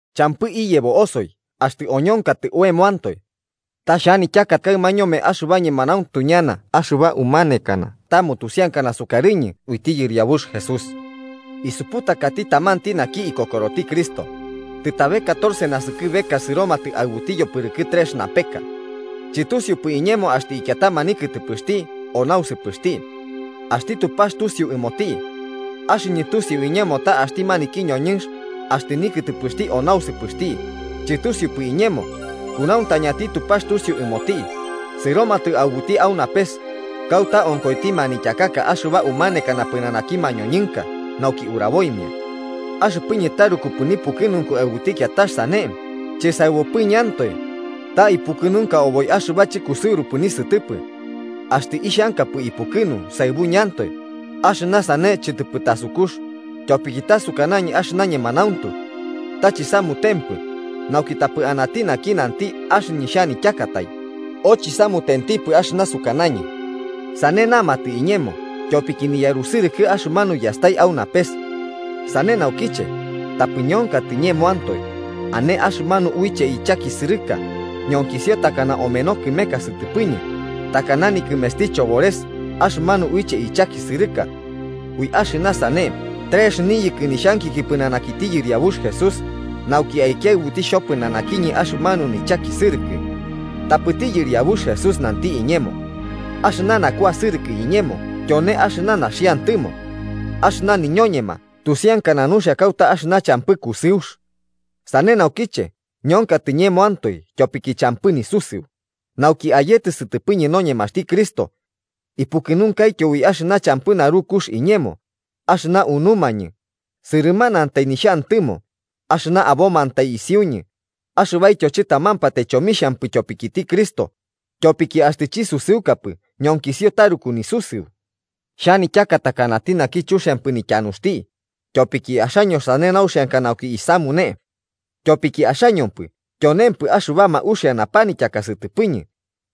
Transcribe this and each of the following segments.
Champɨ iyebo osoi axtɨ oñonkatɨ oemoantoe. Ta xhanityaka kaɨma ñome axɨba ñemanauntu ñana axɨba umanekana ta mutusiankana sukarɨñɨ uiti Yɨriabux Jesús. Isuputakati tamanti naki ikokoroti Cristo, tɨtabe catorce naskɨbeka sɨromatɨ aɨbuti yopɨrɨkɨ trex napeka. Chɨtusiupɨ iñemo axtɨ ikiatama nikɨtɨpɨxti o nausɨpɨxti. Axti Tupax tusiu ɨmoti. Axɨñɨ tusiu iñemo ta axti maniki ñoñɨnx (axtɨ nikɨtɨpɨxti o nausɨpɨxti, chɨtusiupɨ iñemo, kunauntañati Tupax tusiu ɨmoti) sɨromatɨ aɨbuti au napes, kauta onkoiti manityakaka axɨba umanekana pɨnanaki mañoñɨnka nauki uraboimia. Axɨpɨñɨ tarukupɨ nipukɨnunku aɨbuti kiatax sane, chɨsaɨbupɨñɨantoe, ta ipukɨnunka oboi axɨba chɨkusɨurupɨ nisɨtɨpɨ. Axtɨ ixhankapɨ ipukɨnu saɨbuñɨantoe, axɨna sane chɨtɨpɨ tasukux, tyopiki ta sukanañɨ axɨna ñemanauntu. Ta chisamutempɨ, nauki tapɨ anati naki nanti axɨñɨ xhanityakatai o chisamutempɨ axɨna sukanañɨ, sane namatɨ iñemo tyopiki niyarusɨrɨkɨ axɨmanu yastai au napes. Sane naukiche, tapɨ ñonkatɨ ñemoantoe, ane axɨmanu uiche ichakisɨrɨka, ñonkisio takana omeno kɨmeka sɨtɨpɨñɨ, takana nikɨmesti Chobores axɨmanu uiche ichakisɨrɨka. Ui axɨna sane trex niyɨkɨ nixhankiki pɨnanakiti Yɨriabux Jesús nauki aikiaɨbuti xhopɨnanakiñɨ axɨmanu nichakisɨrɨkɨ. Tapɨti Yɨriabux Jesús nanti iñemo: “Axɨna nakuasɨrɨkɨ iñemo tyone axɨna naxiantɨmo. Axɨna niñoñema tusiankana nuxia kauta axɨna champɨ kusɨux.” Sane naukiche ñonkatɨ ñemoantoe tyopiki champɨ nisusɨu, nauki ayetɨ sɨtɨpɨñɨ noñemaxti Cristo. Ipukɨnunkaityo ui axɨna champɨ narukux iñemo, axɨna unumañɨ, sɨrɨmanatai nixhantɨmo, axɨna abomantai isiuñɨ axɨbaityo chɨtamampatai chomixhampɨ tyopikiti Cristo, tyopiki axtɨ chisusɨukapɨ ñonkisio taruku nisusɨu. Xhanityaka takanati naki chuxiampɨ nityanuxti, tyopiki axaño sane nauxianka nauki isamune. Tyopiki axañopɨ tyonemampɨ axɨbama uxia napanityaka sɨtɨpɨñɨ,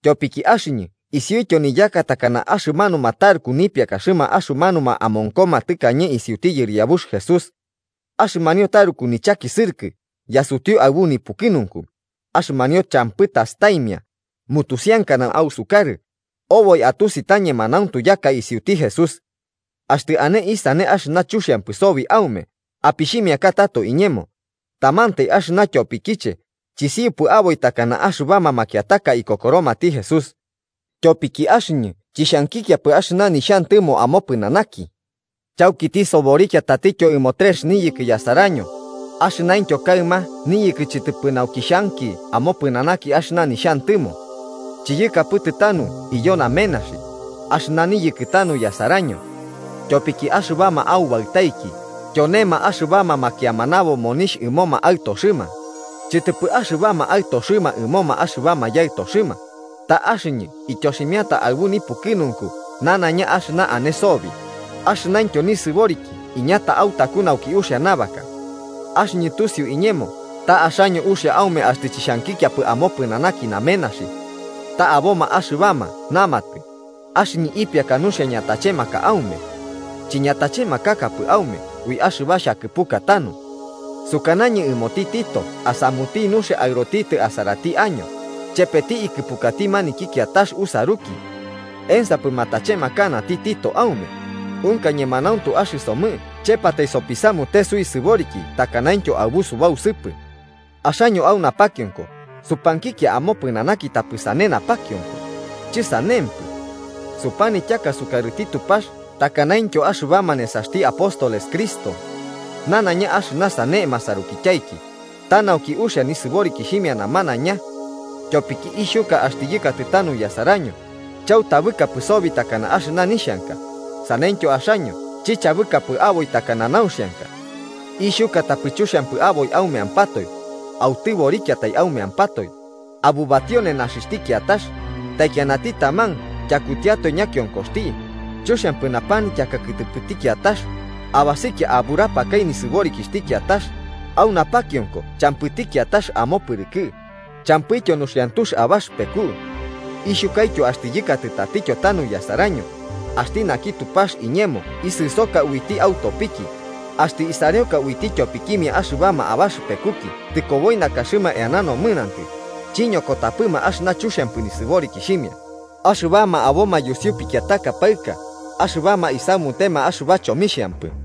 tyopiki axɨñɨ isiuityo niyaka takana axɨmanuma taruku nipiakaxɨma axɨmanuma amonkoma tɨkañe isiuti Yɨriabux Jesús. Axɨmanio taruku nichakisɨrɨkɨ yasutiu aɨbu nipukɨnunku, axɨmanio champɨ tastaimia, mutusiankana ausukarɨ, oboi atusi ta ñemanauntu yaka isiuti Jesús. Axtɨ ane isane axɨna chuxiampɨ sobi aume apixhimiaka tato iñemo, tamantai axɨna tyopikiche chisiupɨ aboi takana axɨbama makiataka ikokoromati Jesús: ¡tyopiki axɨñɨ chixhankikiapɨ axɨna nixhantɨmo amopɨnanaki! Chauki tisoborikia tatityo ɨmo trex niyɨkɨ yasaraño, axɨnaintyo kaɨma niyɨkɨ chɨtɨpɨ nauki xhanki amopɨnanaki axɨna nixhantɨmo. Chiyɨkapɨtɨ tanu iyo namenaxi, axɨna niyɨkɨ tanu yasaraño. Tyopiki axɨbama aubaɨtaiki tyonema axɨbama makiamanabo monixh ɨmoma aɨtoxɨma, chɨtɨpɨ axɨbama aɨtoxɨma ɨmoma axɨbama yaɨtoxɨma. Tapɨ axɨñɨ ityoximiata aɨbu nipukɨnunku nanaiña axɨna ane sobi, axɨnaintyo nisɨboriki iñata autaku nauki uxia nabaka. Axɨñɨ tusiu iñemo ta axaño uxia aume axtɨ chixhankikiapɨ amopɨnanaki namenaxi. Ta aboma axɨbama namatɨ axɨñɨ ipiaka nuxia ñatachemaka aume. Chiñatachemakakapɨ aume ui axɨbama xhakɨpuka tanu. Sukanañɨ ɨmoti Tito asamuti nuxia aɨrotitɨ asarati año, chepeti ikɨpukati maniki kiatax usaruki. ¿Ensapɨ matachemakanati Tito aume? ¿Unka ñemanauntu axɨsomɨ chepatai sopisamute suisɨboriki takanaintyo aɨbu subausɨpɨ? Axaño au napakionko supankikia amopɨnanaki tapɨ sane napakionko, chɨsanempɨ. Supanityaka sukarɨti Tupax takanaintyo axɨbama nesaxti apóstoles Cristo. Nanaiña axɨna sane masarukityaiki, ta nauki uxia nɨsɨborikixhimia namanaiña. Tyopiki ixhuka axtɨ yɨkatɨ tanu yasaraño, chautabɨkapɨ sobi takana axɨna nixhanka, saneityo axaño chichabɨkapɨ aboi takana nauxianka. Ixhuka tapɨ chuxiampɨ aboi aumeampatoe, autɨborikiatai aumeampatoe, abubatio nenaxixhti kiatax, taikianati taman tyakutiatoe ñakionkoxti, chuxiampɨ napanityaka kɨtɨpɨti kiatax, abasikia aburapakai nisɨborikixhti kiatax, au napakiomko champɨti kiatax amopɨrɨkɨ, champɨityo nuxiantux abaxɨpeku. Ixhukaityo axtɨ yɨkatɨ tatityo tanu yasaraño, axti naki Tupax iñemo isɨsoka uiti autopiki, axtɨ isareoka uiti tyopikimia axɨbama abaxɨpekuki tɨkoboi nakaxɨma eana nomɨnantɨ chiñokotapɨma axɨna chuxiampɨ nisɨborikixhimia, axɨbama aboma yusiu pikiataka paɨka axɨbama isamutema axɨba chomixhampɨ.